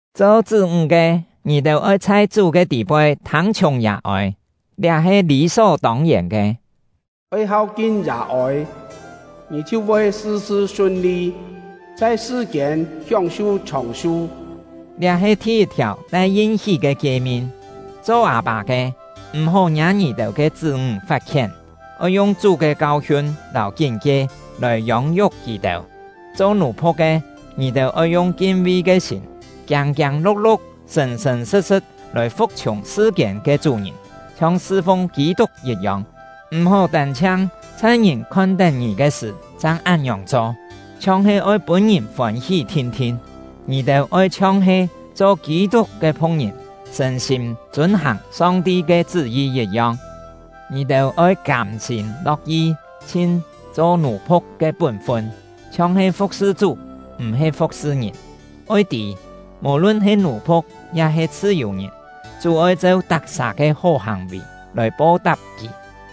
Cho chṳ́-ńg ke, ngì-têu oi chhai Chú ke tî-poi thâng-chhiùng yà-ôi; liá he lî só tông-yèn ke. “Oi hau-kin yà-ôi, ngì chhiu voi sṳ-sṳ sun-li, chhai sṳ-kiên hióng-su chhòng-su!” Liá he thi-yit-thiàu tai yin-hí ke kie-min. Cho â-pâ ke, m̀-hó ngiâ ngì-têu ke chṳ́-ńg fat-khién; oi yung Chú ke kau-hiun lâu kín-kie lòi yông-yuk kì-têu. Cho nù-phu̍k ke, ngì-têu oi yung kin-vi ke sîm, kiâng-kiâng lu̍k-lu̍k, sṳ̀n-sṳ̀n sṳ̍t-sṳ̍t lòi fu̍k-chhiùng sṳ-kiên ke chú-ngìn, chhiong sṳ-fung Kî-tuk yit-yong; m̀-hó tân-chhiang chhai ngìn khon-tén ngì ke sṳ̀ chang án-ngiòng cho, chhiong he oi pûn ngìn fôn-hí thin-thin; ngì-têu oi chhiong he cho Kî-tuk ke phu̍k-ngìn, sṳ̀n-sîm chûn-hàng Song-ti ke chṳ́-yi yit-yong. Ngì-têu oi kâm-sîm lo̍k-yi chhin cho nù-phu̍k ke pún-fun, chhiong he fu̍k-sṳ Chú, m̀-he fu̍k-sṳ ngìn. Oi tî, mò-lun he nù-phu̍k ya-he chhṳ-yù-ngìn, Chú oi cheu tak-sà ke hó hàng-vì lòi po-tap kì.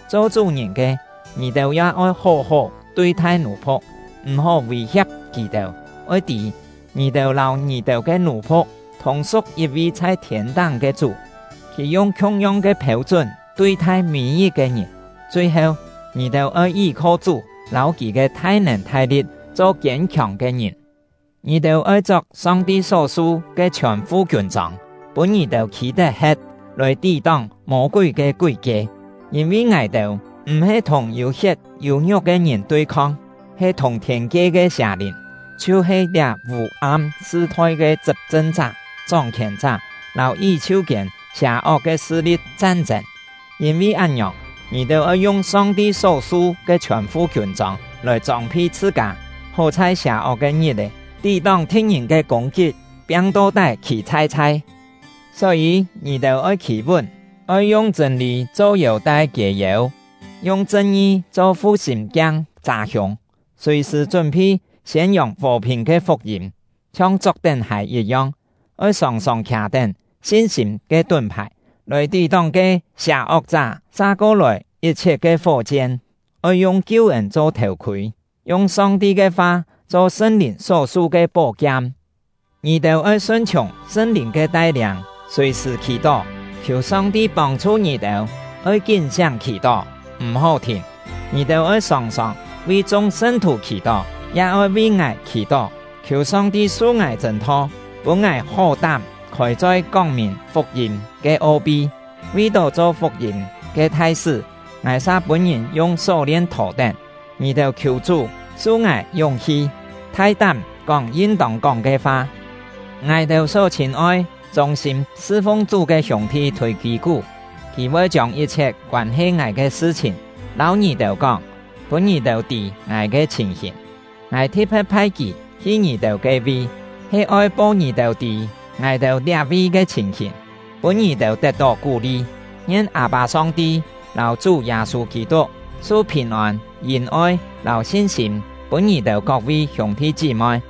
Cho chú-ngìn ke, ngì-têu ya oi hó-hó tui-thai nù-phu̍k, m̀-hó vî-hia̍p kì-têu. Oi tî, ngì-têu lâu ngì-têu ke nù-phu̍k thùng-su̍k yit-vi chhai thiên-táng ke Chú; Kì yung khiung-yong ke phêu-chún tui-thai mî-yit-ke ngìn. Chui-heu, ngì-têu oi yí-kho Chú lâu kì ke thai-nèn thai-li̍t cho kiên-khiòng ke ngìn. Ngì-têu oi chok Song-ti só su ke chhiòn-fu kiûn-chông, pûn ngì-têu khî tet-he̍t, lòi tí-tóng Mô-kúi ke kúi-kie. Yîn-vi ngài-têu m̀-he thùng yû-hiet yû-ngiuk ke ngìn tui-khong; he thùng thiên-kie ke sià-lìn, chhiu-he liá vû-am sṳ-thoi ke chṳp-chṳn-chá, chóng-khièn-chá, lâu yí-chhiu-kiên sià-ok ke sṳ-li̍t chan-chên. Yîn-vi án-ngiòng, ngì-têu oi yung Song-ti só su ke chhiòn-fu kiûn-chông lòi chông-phi chhṳ-kâ, hó chhai sià-ok ke ngit-è tí-tóng thi̍t-ngìn ke kûng-kit, piang to-tái, khî-chhai-chhai. Só-yî, ngì-têu oi khî-vún. Oi yung chṳ̂n-lî cho yêu-tai kiê-yêu, yung chṳn-ngi cho fu-sîm-kiang châ-hiûng, sùi-sṳ̀ chún-phi siên-yòng fò-phìn ke fuk-yîm, chhiong chok-tén hài yit-yong. Oi sòng-sòng khià-tén sin-sîm ke tún-phài, lòi tí-tóng ke sià-ok-chá sa-ko-lòi yit-chhiet ke fó-chien. Oi yung kiu-ên cho thèu-khûi, yung Song-ti ke fa cho Sṳn-Lìn só-su ke pó-kiam. Ngì-têu oi sun-chhiùng Sṳn-Lìn ke tai-liâng sùi-sṳ̀ khì-tó, khiù Song-ti pông-chhu ngì-têu; oi kín-siáng khì-tó, m̀-hó thìn. Ngì-têu oi sòng-sòng vi chung sṳn-thù khì-tó; ya oi vi ngài khì-tó, khiù Song-ti su ngài chṳ̂n-tho, pûn ngài hó-tám khôi-choi kóng-mìn fuk-yîm ke o-pi. Vi-tó cho fuk-yîm ke thai-sṳ́, ngài sa pûn-ngìn yung só-lien thò-tén. Ngì-têu oi khiù Chú su ngài yúng-hi, thai-tám kóng yin-tông kóng ke fa. Ngài-têu só chhîn-oi, chûng-sîm sṳ-fung Chú ke hiûng-thi Thûi-kî-kú, kì voi chiông yit-chhiet koân-he ngài ke sṳ-chhìn lâu ngì-têu kóng, pûn ngì-têu tî ngài ke chhìn-hìn. Ngài thi̍t-phe̍t phai kì hi ngì-têu ke-vi, he oi po ngì-têu tî ngài-têu liá-vi ke chhìn-hìn, pûn ngì-têu tet-tó kú-li. Ngien Â-pâ Song-ti lâu Chú Yâ-sû Kî-tuk su phìn-ôn, yìn-oi, lâu sin-sîm pûn ngì-têu kok-vi hiûng-thi chí-moi!